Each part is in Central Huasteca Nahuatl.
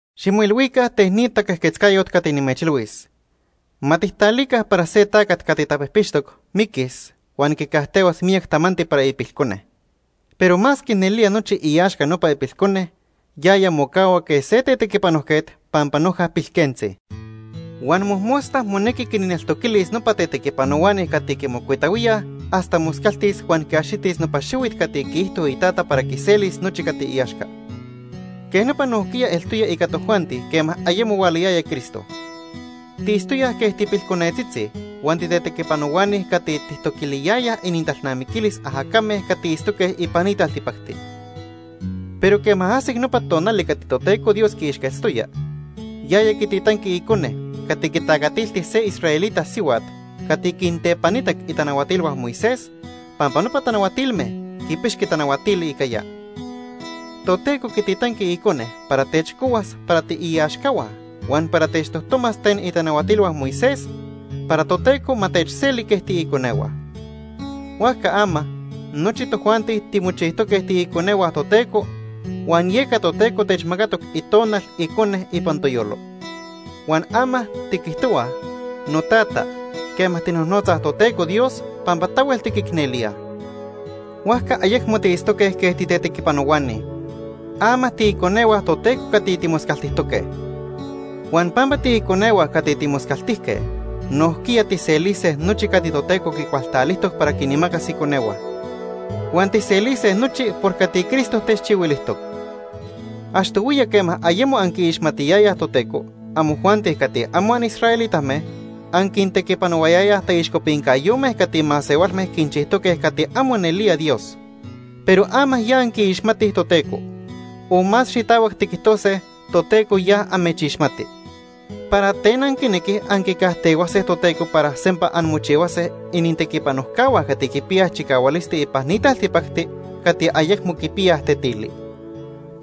Ximoilhuica ten ni taquejquetzcayot cati nimechilhuis. Ma tijtalica para se tacat cati tapijpixtoc miquis huan quicajtehuas miyac tamanti para ipilcone. Pero masque nelía nochi iaxca nopa ipilcone, yaya mocahua quej se tetequipanojquet pampa noja pilquentzi. Huan mojmosta monequi quinneltoquilis nopa tetequipanohuani cati quimocuitahuíaj hasta moscaltis huan quiaxitis nopa xihuit cati quiijto itata para quiselis nochi cati iaxca. Quej nopa nojquiya eltoya ica tojuanti quema ayemo hualayaya Cristo. Tiitztoyaj quej tipilconetzitzi huan titetequipanohuani cati tijtoquiliyayaj inintalnamiquilis ajacame cati itztoque ipan ni taltipacti. Pero quema ajsic nopa tonali cati Toteco Dios quiixquetztoya, yaya quititanqui Icone cati quitacatilti se israelita sihuat cati quintepanitac itanahuatilhua Moisés pampa nopa tanahuatilme quipixqui tanahuatili ica ya. Toteco quititanqui Icone para techcohuas para tiiaxcahua huan para techtojtomas ten itanahuatilhua Moisés, para Toteco ma techseli quej tiiconehua. Huajca ama nochi tojuanti timochijtoque tiiconehua Toteco, huan yeca Toteco techmacatoc Itonal Icone ipan toyolo. Huan ama tiquijtohuaj: “Notata”, quema tijnojnotzaj Toteco Dios pampa tahuel tiquicnelíaj. Huajca ayecmo tiitztoque quej titetequipanohuani. Ama tiiconehua Toteco cati timoscaltijtoque. Huan pampa tiiconehua cati timoscaltijque, nojquiya tijselise nochi cati Toteco quicualtalijtoc para quinmacas iconehua. Huan tijselise nochi por cati Cristo techchihuilijtoc. Achtohuiya quema ayemo anquiixmatiyayaj Toteco, amojuanti cati amo anisraelitame anquintequipanohuayayaj taixcopincayome cati masehualme quinchijtoque cati amo nelía Dios. Pero ama ya anquiixmatij Toteco o más xitahuac tiquijtose, Toteco ya amechixmati, ¿para ten anquinequij anquicajtehuase Toteco para sempa anmochihuase inintequipanojcahua cati quipiyaj chicahualisti ipan ni taltipacti cati ayecmo quipiyaj tetili?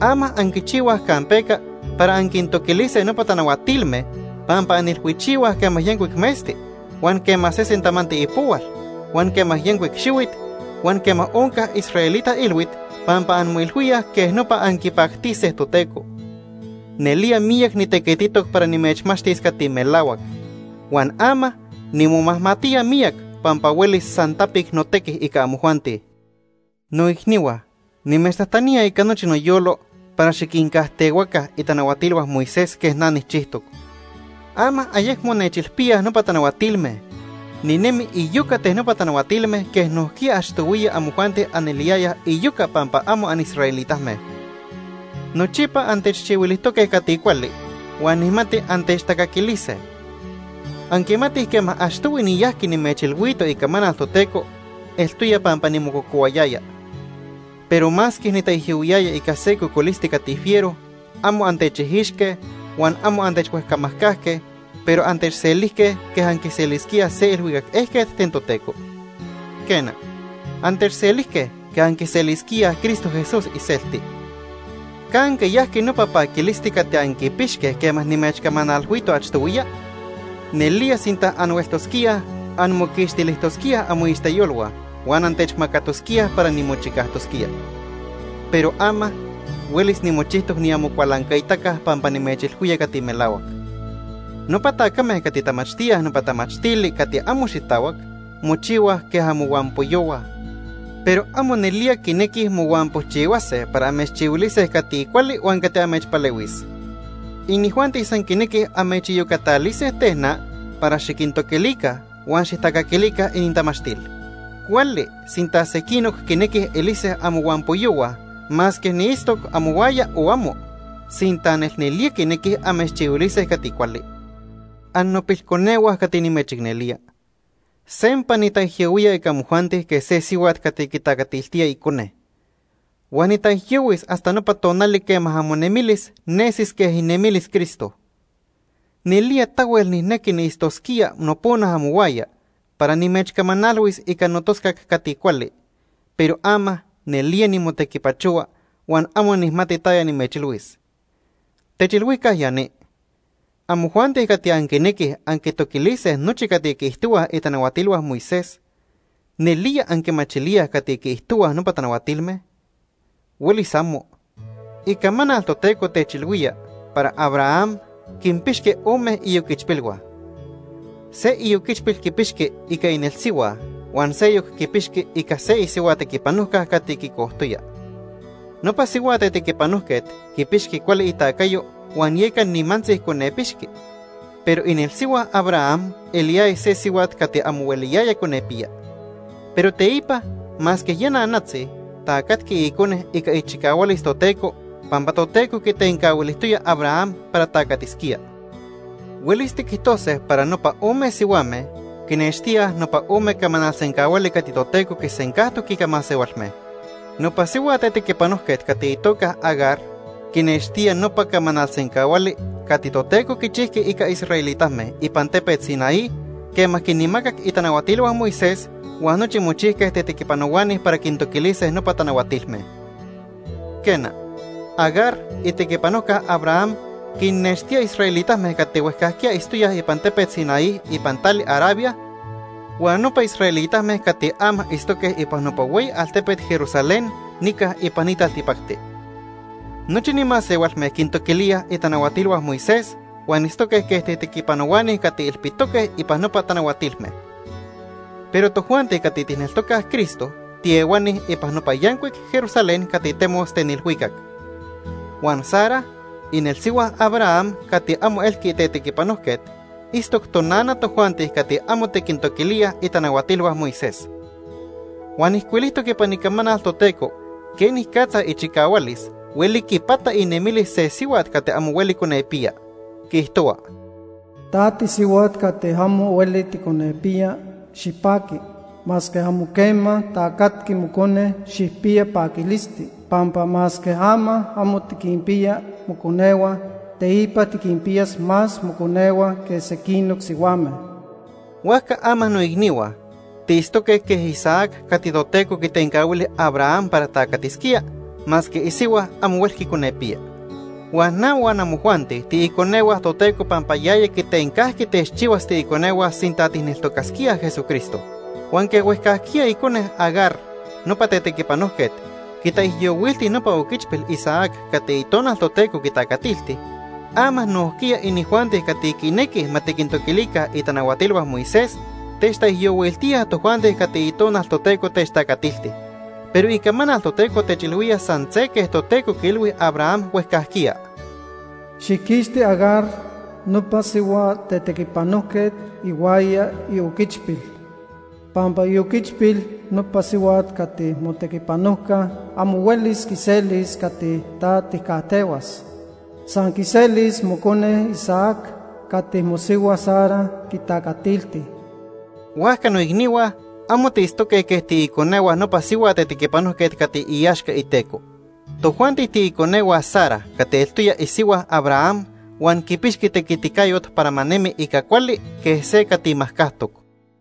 Ama anquichihuaj campeca para anquintoquilise nopa tanahuatilme pampa anilhuichihuaj quema yancuic metzti, huan quema sesen tamanti ipohual, huan quema yancuic xihuit, huan quema onca israelita ilhuit, pampa anmoilhuíaj quej nopa anquipactise Toteco. Nelía miyac nitequititoc para nimechmachtis cati melahuac, huan ama nimomajmatía miyac pampa huelis san tapic notequi ica amojuanti. Noicnihua, nimechtajtanía ica nochi noyolo para xiquincajtehuaca itanahuatilhua Moisés quej na nijchijtoc. Ama ayecmo nechilpíaj nopa tanahuatilme. Ninemi iyoca ten nopa tanahuatilme quej nojquiya achtohuiya amojuanti aneliyayaj iyoca pampa amo anisraelitame. Nochipa antechchihuilijtoque cati cuali huan nijmati antechtacaquilise. Anquimatij quema achtohui niyajqui nimechilhuito icamanal Toteco, eltoya pampa nimococohuayaya. Pero masque nitaijyohuiyaya ica se cocolisti cati fiero, amo antechijixque huan amo antechhuejcamajcajque, pero antechselijque quej anquiselisquíaj se ilhuicac ejquet ten Toteco. Quena, antechselijque quej anquiselisquíaj Cristo Jesús iselti. ¿Canque yajqui nopa paquilisti cati anquipixque quema nimechcamanalhuito achtohuiya? Nelía sinta anhueltosquíaj, anmoquixtilijtosquíaj amoixteyolhua huan antechmacatosquíaj para nimochicajtosquía. Pero ama, huelis nimochijtoc niamocualancaitaca pampa nimechilhuía cati melahuac. Nopa tacame cati tamachtíaj nopa tamachtili cati amo xitahuac mochihuaj quej amohuampoyohua, pero amo nelía quinequij mohuampojchihua para amechchihuilise cati cuali huan cati amechpalehuis. Inijuanti san quinequij amechiyocatalise ten na para xiquintoquilica huan xijtacaquilica inintamachtil. Cuali sinta sequinoc quinequij elise amohuampoyohua masque niitztoc amohuaya o amo, sinta nelnelía quinequij amechchihuilise cati cuali. Annopilconehua cati nimechicnelía. Sempa nitaijyohuía ica amojuanti quej se sihuat cati quitacatiltía icone. Huan nitaijyohuis hasta nopa tonali quema amonemilis nesis quej inemilis Cristo. Nelía tahuel nijnequi niitztosquía nopona amohuaya para nimechcamanalhuis ica notoscac cati cuali, pero ama nelía nimotequipachohua huan amo nijmati taya nimechilhuis. Techilhuica ya ni, amojuanti cati anquinequij anquitoquilise nochi cati quiijtohuaj itanahuatilhua Moisés. ¿Nelía anquimachilíaj cati quiijtohuaj nopa tanahuatilme? ¡Huelis amo! Icamanal Toteco techilhuía para Abraham quinpixqui ome ioquichpilhua. Se ioquichpil quipixqui ica inelsihua huan seyoc quipixqui ica se isihua tequipanojca cati quicojtoya. Nopa sihua tetequipanojquet quipixqui cuali itacayo huan yeca nimantzi conepixqui. Pero inelsihua Abraham eliyaya se sihuat cati amo hueliyaya conepiya. Pero teipa, masque ya nanatzi tacatqui icone ica ichicahualis Toteco pampa Toteco quitencahuilijtoya Abraham para tacatisquía. Huelis tiquijtose para nopa ome sihuame quinextía nopa ome camanal sencahuali cati Toteco quisencajtoc ica masehualme. Nopa sihua tetequipanojquet cati itoca Agar quinextía nopa camanal sencahuali cati Toteco quichijqui ica israelitame ipan tepet Sinaí quema quinmacac itanahuatilhua Moisés huan nochi mochijque tetequipanohuani para quintoquilise nopa tanahuatilme. Quena, Agar itequipanojca Abraham quinnextía israelitame cati huejcajquiya itztoyaj ipan tepet Sinaí ipan tali Arabia huan nopa israelitame cati ama itztoque ipan nopa hueyi altepet Jerusalén nica ipan ni taltipacti. Nochi ni masehualme quintoquilíaj itanahuatilhua Moisés huan itztoque quej tetequipanohuani cati ilpitoque ipan nopa tanahuatilme. Pero tojuanti cati tijneltocaj Cristo tiehuani ipan nopa yancuic Jerusalén cati temos ten ilhuicac. Huan Sara inelsihua Abraham cati amo elqui tetequipanojquet, itztoc tonana tojuanti cati amo tiquintoquilíaj itanahuatilhua Moisés. Huan ijcuilijtoc ipan Icamanal Toteco quenicatza ichicahualis hueli quipata inemilis se sihuat cati amo hueli conepiya. Quiijtohua: “Ta tisihuat cati amo hueli ticonepiya, xipaqui. Masque amo quema tacatqui mocone, xijpiya paquilisti. Pampa masque ama amo tiquinpiya moconehua, teipa tiquinpiyas más moconehua que sequinoc sihuame.” Huajca ama noicnihua, tiitztoque quej Isaac cati Toteco quitencahuili Abraham para tacatisquía masque isihua amo huelqui conepiya. Huan na huan amojuanti tiiconehua Toteco pampa yaya quitencajqui techchihuas tiiconehua sinta tijneltocasquíaj Jesucristo. Huan quej huejcajquiya icone Agar, nopa tetequipanojquet, quitaijyohuilti nopa oquichpil Isaac cati Itonal Toteco quitacatilti, ama nojquiya inijuanti cati quinequij ma tiquintoquilica itanahuatilhua Moisés techtaijyohuiltíaj tojuanti cati Itonal Toteco techtacatilti. Pero Icamanal Toteco techilhuía san se quej Toteco quiilhui Abraham huejcajquiya: “Xijquixti Agar, nopa sihua tetequipanojquet ihuaya ioquichpil, pampa ioquichpil nopa sihuat cati motequipanojca amo huelis quiselis cati ta tijcajtehuas. San quiselis mocone Isaac cati mosihua Sara quitacatilti.” Huajca noicnihua, amo tiitztoque quej tiiconehua nopa sihua tetequipanojquet cati iaxca iteco. Tojuanti tiiconehua Sara cati eltoya isihua Abraham huan quipixqui tequiticayot para ma nemi ica cuali quej se cati majcajtoc.